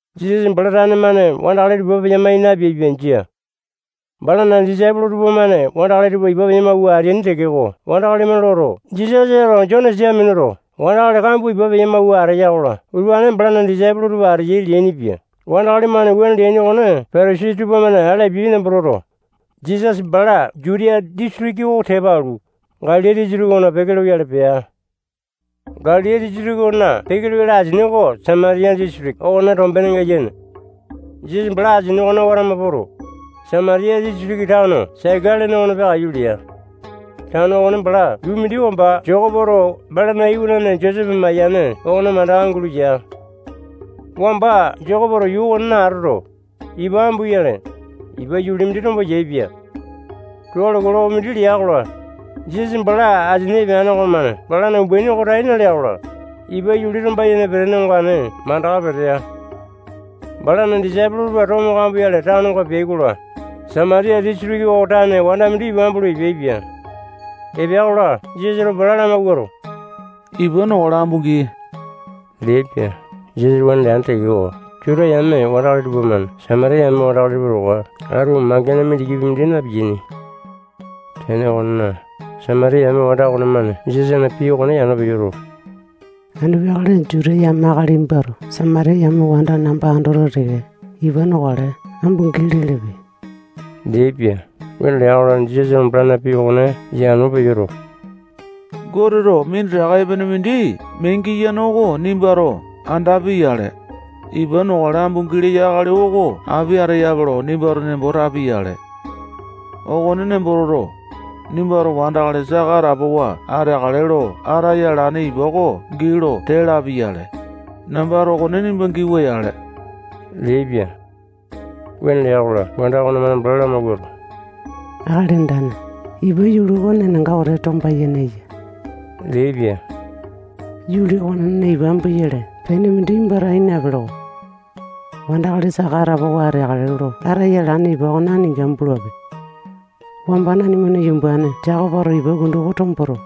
Jisasa bala tane-mane wandakali tupa ipa peya-mai napeaipia. Jia. Balana disaipolo tupamane wandakali tupa ipa peya-mawua ateaini tekeko, wandakali-mane loto, Jisasato Jone sia minuto, wandakali kambua ipa peya-mawua ateya-kola, utupane balana disaipolo tupa ateyai leainipia. Wandakali-mane wuane leaini okone Patasai tupamane ale apiai nembo toto, Jisasa bala Jutiya disitiki oko tepa alu, Galili disitiki okona peke loyale pea. Galili disitiki okona peke loyale asini oko Samatiya disitiki okona tombenenga yene. Jisasa bala asini okone watama poto, Samatiya disitiki tano Saika lene okona peakaiyu lea. Tano okone bala yuu mindi wamba Jekopoto balana iwanane Josepe mayane okona mandaka gulo ya. Wamba Jekopoto yuu okonena atoto, ipa ambuyale, ipa yuli mindi tombo yaepia. Tualo kilokopi mindi lea-kola, Jisasa bala asini epeane okomane balana umbaini oko tai nalea-kola, ipa yuli tomba-yene petene ongane mandaka petea. Balana disaipolo tupa tomo kamboyale tanonga peai-kola, Samatiya disitiki okona tane wanda mindi ipa ambulu epeaipia. Epea-kola, Jisasato bala lamawuato, ipa nokale. Ambu gii leaipia. Jisasato wuane leane tekeko, Juta yame wandakali tupamane Samatiya yame wandakali tupa towa atu mangene mindikipi mindi na-piyainipia. Tene okonena, Samatiya yame wanda okonemane Jisasana pii okone yano peyoto, anu peakale Juta yame akali nimbato Samatiya yame wanda namba andoto teke, ipa nokale, ambu gii lelepe leaipia. Wuane lea-kola, Jisasato balana pii okone yano peyoto, Goteto minditaka epene mindi mee giyane oko nimbato andapi-yale, ipa nokale ambu gii leyo akali oko api ateyape lo nimbato nembo tapi-yale. Okone nembo toto, nimbato wandakali saka atapowa ateakale lo ataya alane ipa oko gii lo tee lapi-yale, nambato okone nimba giwa-yale leaipia. Wuane lea-kola, wanda okonemane bala lamawuato, Akali Andane, ipa yuli oko nenanga wete tomba-yene eya leaipia. Yuli okonena ipa ambuyale pene mindi nimbato ai napele-ko. Wandakali saka atapowa ateakale lo ataya alane ipa okone aninga ambulape. Wamba nanimana yumbane Jekopoto ipa kundu oko tomboto,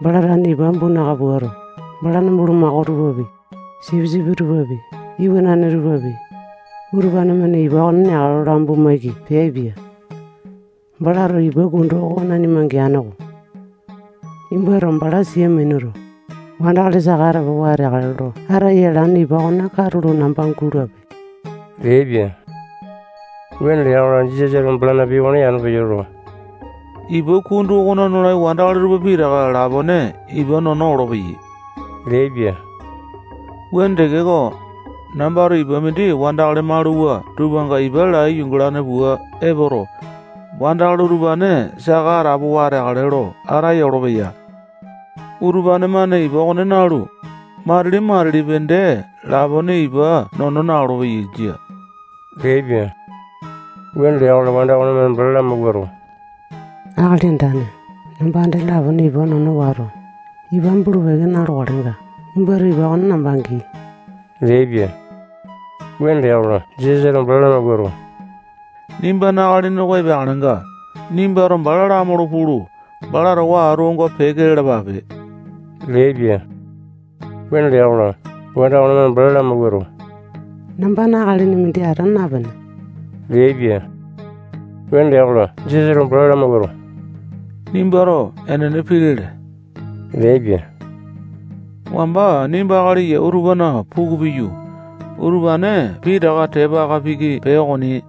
bala tane ipa ambu naka puato, balana bulumako tupapi, sipisipi tupapi, iwanane tupapi, utupane-mane ipa oko neakale lo ambu maiki peaipia. Balato ipa kundu oko nanima geane-ko. Nimbato bala sia minuto, wandakali saka atapowa ateakale lo ataya alane ipa okone katulo namba gulape leaipia. Wuane lea-kola, Jisasato balana pii okone yano peyoto, ipa kundu okona nolai wandakali tupa pitaka lapone ipa nono olopeyai leaipia. Wuane tekeko, nambato ipa mindi wandakali maluwa tupanga ipa lai yungalane pua epoto, wandakali utupane saka atapowa ateakale lo ataya olopeya leaipia. Utupane-mane ipa okone nalu, matili-matilipi dee lapone ipa nono na-olopeyai. Jia. Wuane lea-kola, wanda okonemane bala lamawuato, Akali Andane, namba dee lapone ipa nono wato, ipa ambulu-peke na-lokalenga, nimbato ipa okone namba gii leaipia. Wuane lea-kola, Jisasato bala lamawuato, nimbana akalini oko epeakalenga, nimbato bala lamaulu pulu, bala towa atu onga peke lalapape leaipia. Wuane lea-kola, wanda okonemane bala lamawuato, nambana akalini mindi ata napene leaipia. Wuane lea-kola, Jisasato bala lamawuato, nimbato enene pii lele leaipia. Wamba nimba akali yau tupana puku piyu, utupane pitaka tepa aka piki pee okoni.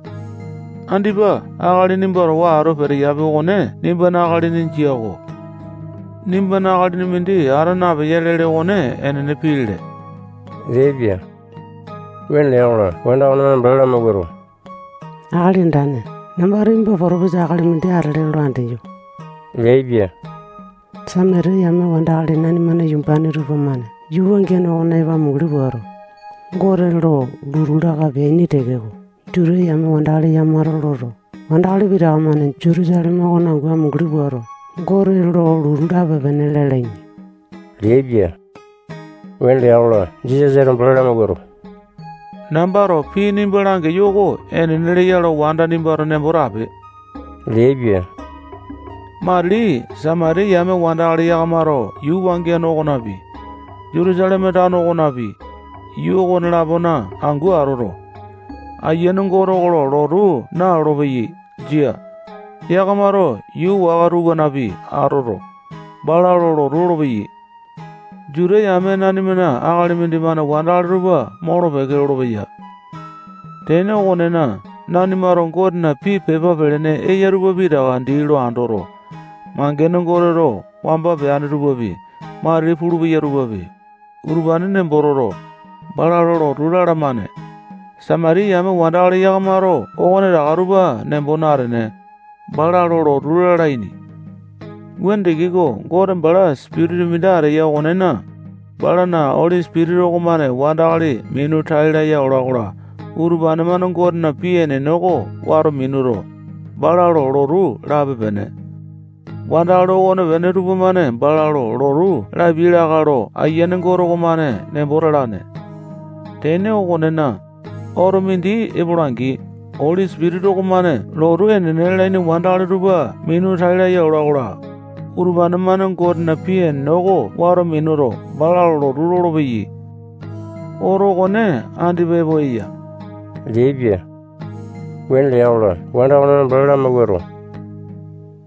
Andipa akali nimba towa atu peteyapi okone nimbana akalini jia-ko. Nimbana akalini mindi ata napeya lele okone enene pii lele leaipia. Wuane lea-kola, wanda okonemane bala lamawuato, Akali Andane, nambato nimba potopisa akali mindi atele lo andeyo leaipia. Samatiya yame wandakali nanimana yumbane tupamane yuu wangiane okona epo amunguli puato, Gote lo lotu laka peaini tekeko, Juta yame wandakali yakamato loto, wandakali pitaka-mane Jutusaleme okona angu amunguli puato, Gote lo lotu lape-pene lalaini leaipia. Wuane lea-kola, Jisasato bala lamawuato, nambato pii nimba langeyo oko enene leya lo wanda nimbato nembo tape leaipia. Matili Samatiya yame wandakali yakamato yuu wangiane okonapi, Jutusaleme tano okonapi, yuu okone-lapona angu atoto, Ayiane Gote oko lo lotu nalolo-peyai. Jia. Yakamato yuu waka tupanapi atoto, bala lo lotu lolopeyai. Juta yame nanimana akali mindimane wandakali tupa molo-peke lolopeya. Tene okonena, nanimato Gotena pii pepa pelene eya tupa pitaka dii lo andoto, mangene Goteto wamba peane tupapi, matili pulupeya tupapi, utupane nembo toto, bala lo lotu lalamane. Samatiya yame wandakali yakamato okonetaka tupa nembo natene, bala lo lotu lalaini. Wuane tekeko, Gote bala sipitisa mindi ateya okonena, balana Oli Sipitisa okomane wandakali minu tai laya ola-kola, utupane-mane Gotena pii enene oko wato minuto, bala lo lotu lape-pene. Wandakali okonepene tupamane bala lo lotu lapiai lakae lo Ayiane Gote okomane nembo talane. Tene okonena, oto mindi epola-angi, Oli Sipitisa okomane lotu enene lalaini wandakali tupa minu tai laya ola-kola, utupane-mane Gotena pii enene oko wato minuto, bala lo lotu lolopeyai. Oto okone andipa epo eya leaipia. Wuane lea-kola, wanda okonemane bala lamawuato,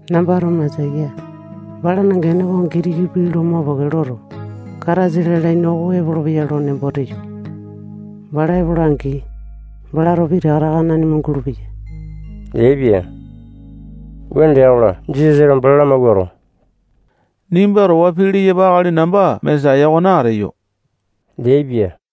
nambato Mesaya, balana gene okone Gitiki pii mopeke loto, Kataisa lalaini oko epolopeya nembo teyo. Bala epola-angi, balato pitaka taka nanima langulu-peya leaipia. Wuane lea-kola, Jisasato bala lamawuato, nimba towa pii leyapa akali namba Mesaya okone ateyo leaipia.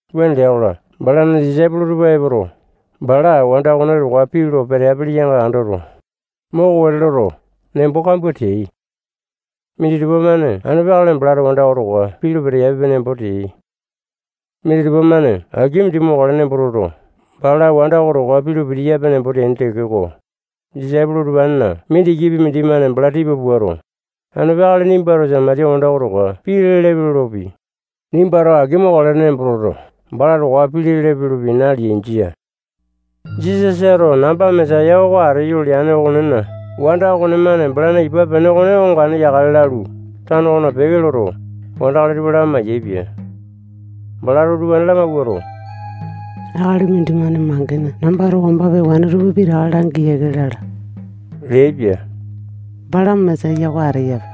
Wuane lea-kola, balana disaipolo tupa epoto, bala wanda okone towa pii lo peteapele yanga andoto, moko wete loto, nembo kambua teai. Minditupa-mane anu peakale balato wanda oko towa pii lo pitiyape nembo teai. Minditupa-mane aki mindi mokale nembo toto, bala wanda oko towa pii lo pitiyape nembo teaini tekeko, disaipolo utupanena mindikipi mindimane bala tipa puato, anu peakale nimbato Samatiya wanda oko towa pii lelepe lopi, nimbato aki mokale nembo toto, bala towa pii lelepe lopi, naleai. Jia. Jisasato namba Mesaya oko ateyo leane okonena, wanda okonemane balana ipa pene oko ongane yakale lalu, tano okona peke loto, wandakali tupa lamai-yaepia. Balato utupane lamawuato, akali mindimane mangene nambato wamba pewane tupa pitaka langi yiake lala leaipia. Bala Mesaya oko ateyape.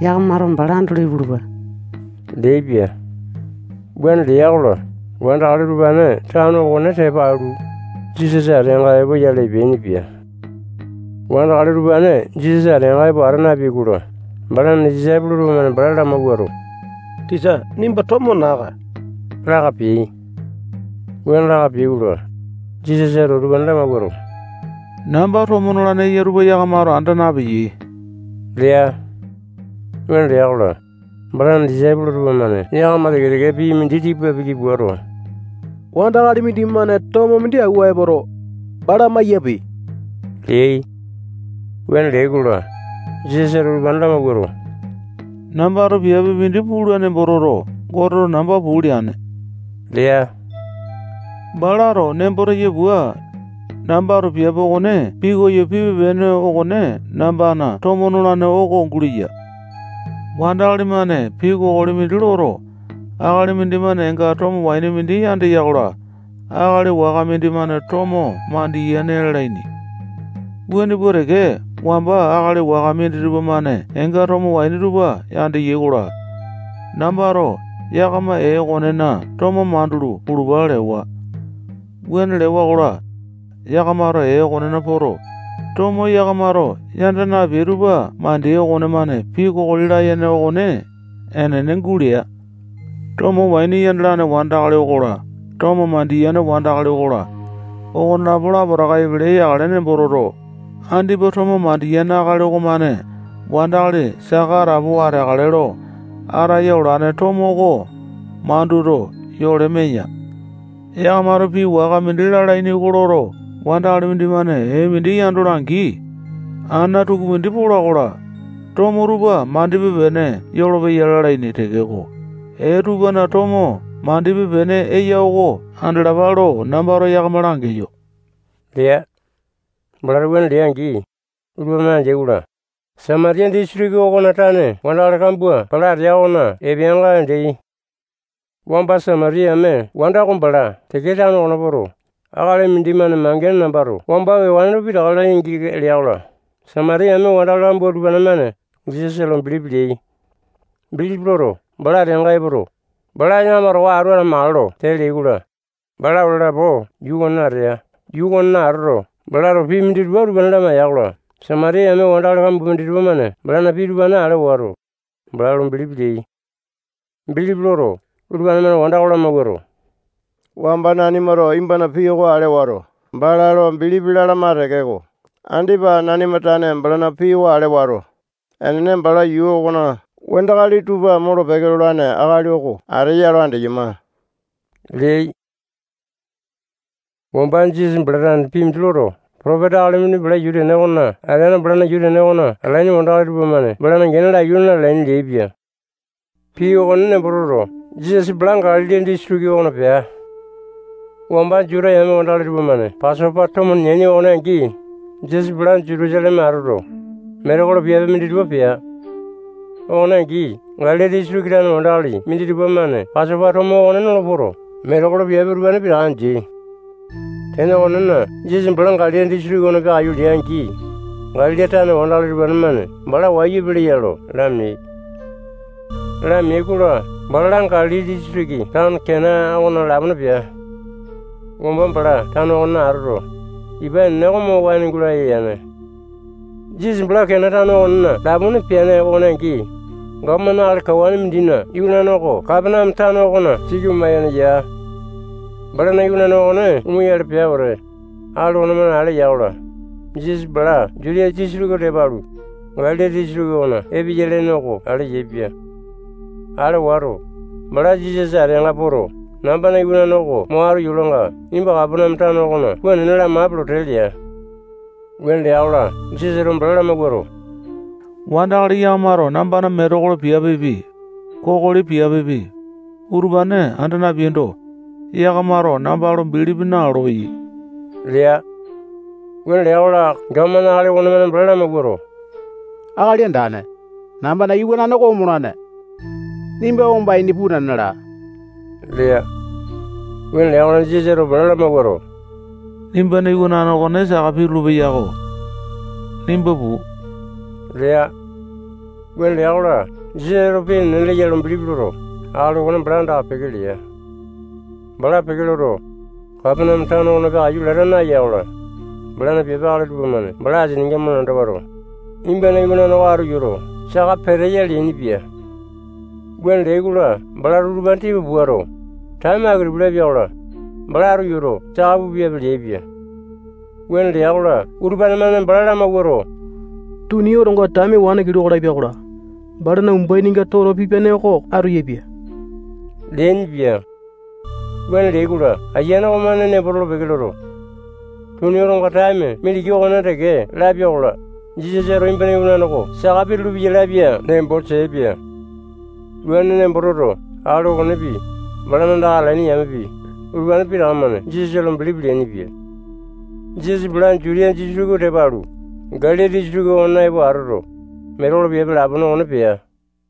Yakamato bala andolo ipulupa leaipia. Wuane lea-kola, wandakali utupane tano okone tepa alu, Jisasa ateanga epoyale epeainipia. Wandakali utupane Jisasa ateanga epo ata nayai-kola, balana disaipolo tupamane bala lamawuato, tisa, nimba tomo naa-kae laka peai. Wuane laka peai-kola, Jisasato utupane lamawuato, namba tomo nolane eya tupa yakamato anda napeyai lea. Wuane lea-kola, balana disaipolo tupamane yakama teke-teke pii mindi tipa piki puato, wandakali mindimane tomo mindi awua epoto, bala maiyape leai. Wuane leai-kola, Jisasato utupane lamawuato, nambato piape mindi pula nembo toto, Goteto namba puu leane lea. Balato nembo teya pua, nambato piape okone pikoyo pipe-pene okone nambana tomo nolane oko guleya. Wandakali-mane pii kokoli mindi loto, akali mindimane eenga tomo waini yandeya-kola, akali waka mindimane tomo mandiyane lalaini. Wuane pua teke, wamba wandakali waka minditupa-mane eenga tomo waini tupa yandeai-kola, nambato yakama ee okonena tomo mandulu pululpa lewa. Wuane lewa-kola, yakamato ee okonena poto, tomo yakamato yanda napeai tupa mandeai okonemane pii kokoli layene okone enene gulea. Tomo waini yandalane wandakali okola, tomo mandiyane wandakali okola, okonelapo lapotaka epele yakale nembo toto, andipa tomo mandiyane akali okomane wandakali saka atapowa ateakale lo ataya olane tomo oko manduto, yole meya. Yakamato pii waka mindi lalaini oko loto, wandakali mindimane ee mindi yandola-angi, ana tukumindi pola-kola, tomo tupa mandipe-pene yolopeya lalaini tekeko, ee tupana tomo mandipe-pene eya oko andalapa lo nambato yakama langeyo lea. Balato wuane lea-angi, utupane-mane andeai-kola, Samatiya disitiki okona tane wandakali kambua bala atea okona epeainga andeai. Wamba Samatiya yame wanda oko bala Saika tano okona poto, akali mindimane mangene nambato wamba pewane tupa pitaka langi yiake lea-kola, Samatiya yame wandakali kambua utupane-mane Jisasa lo bilipi leai. Bilipi loto, bala ateanga epoto, bala yakama towa atu atamakale lo tee leai-kola, bala ole lapo yuu okonena atea. Yuu okonena atoto, balato pii minditupa utupane lamaiya-kola, Samatiya yame wandakali waka kambua minditupa-mane balana pii utupane ale wato, bala lo bilipi leai. Bilipi loto, utupane-mane wanda oko lamawuato, wamba nanimato nimbana pii oko ale wato, bala lo bilipi lalama tekeko, andipa nanima tane balana pii oko ale wato, enene bala yuu okona wandakali tupa molo-peke lolane akali oko ateya lo andeyama leai. Wamba Jisasa bala tane pii mindi loto, potopisa akali mindi balana yuu tene okona ateando, balana yuu tene okona atalaini wandakali tupamane balana gene oko laiyu na-lalaini leaipia. Pii okone nembo toto, Jisasa bala Galili disitiki okona pea. Wamba Juta yame wandakali tupamane Pasopa tomo neaini okone angi, Jisasa bala Jutusaleme atoto, metekolo piape minditupa pea. Okone angi, Galili disitiki tane wandakali minditupa-mane Pasopa tomo okone nolo poto, metekolo piape utupane pitaka andeai. Tene okonena, Jisasa bala Galili disitiki okona peakaiyu lea-angi, Galili tane wandakali utupane-mane bala wayu epeleya lo lameai. Lameai-kola, bala Galili disitiki tano Kena okona lapone pea. Wamba bala tano okonena atoto, ipa enene oko mo waene gulaya yane. Jisasa bala Kena tano okonena lapone peane okone angi, gapomane akali kawane mindina iwanane oko Kapaneame tano okona siki oma-yene ya. Balana iwanane okone omoyale pea wete, akali okonemane ale ya-kola, Jisasa bala Jutiya disitiki oko tepa alu, Galili disitiki okona epeya lene oko ale yaepia. Ale wato, bala Jisasa ateanga poto, nambana iwanane oko mo atu yolanga, nimba Kapaneame tano okona puu nena lamape lo tee lea. Wuane lea-kola, Jisasato bala lamawuato, wandakali yakamato nambana metekolo piapepi, kokoli piapepi, utupane anda napeaindo, yakamato namba lo bilipi nalolo-peyai lea. Wuane lea-kola, gapomane akali okonemane bala lamawuato, Akali Andane, nambana iwanane oko omolane. Nimba wamba ini puu nena laa lea. Wuane lea-kola, Jisasato bala lamawuato, nimbana iwanane okone saka pitulu-peyako. Nimba puu lea. Wuane lea-kola, Jisasato pii enene leya lo bilipi loto, akali okone bala andaka peke lea. Bala peke loto, Kapaneame tano okona peakaiyu lata naeya-kola, balana piape akali tupamane bala asininga malanda wato, nimbana iwanane oko atu yoto, saka peteya leainipia. Wuane leai-kola, balato utupane tipa puato, taeme aki-tupi lapia-kola, bala atu yoto, saka pupiape leaipia. Wuane lea-kola, utupane-mane bala lamawuato, tuni otonga taeme wane kiloko lapia-kola, balana umbaininga toto pipiane oko atu yapia leainipia. Wuane leai-kola, ayiane okonemane nembo tolo-peke loto, tuni otonga taeme mindiki okonena teke lapia-kola, Jisasato nimbana iwanane oko saka pitulu-peya lapia nembo teaipia. Wuane nembo toto, akali okonepi, balana andaka atalaini yamepi, utupane pitaka-mane Jisasa lo bilipi leainipia. Jisasa bala Jutiya disitiki oko tepa alu, Galili disitiki okona epo atoto, metekolo piape lapone okone pea.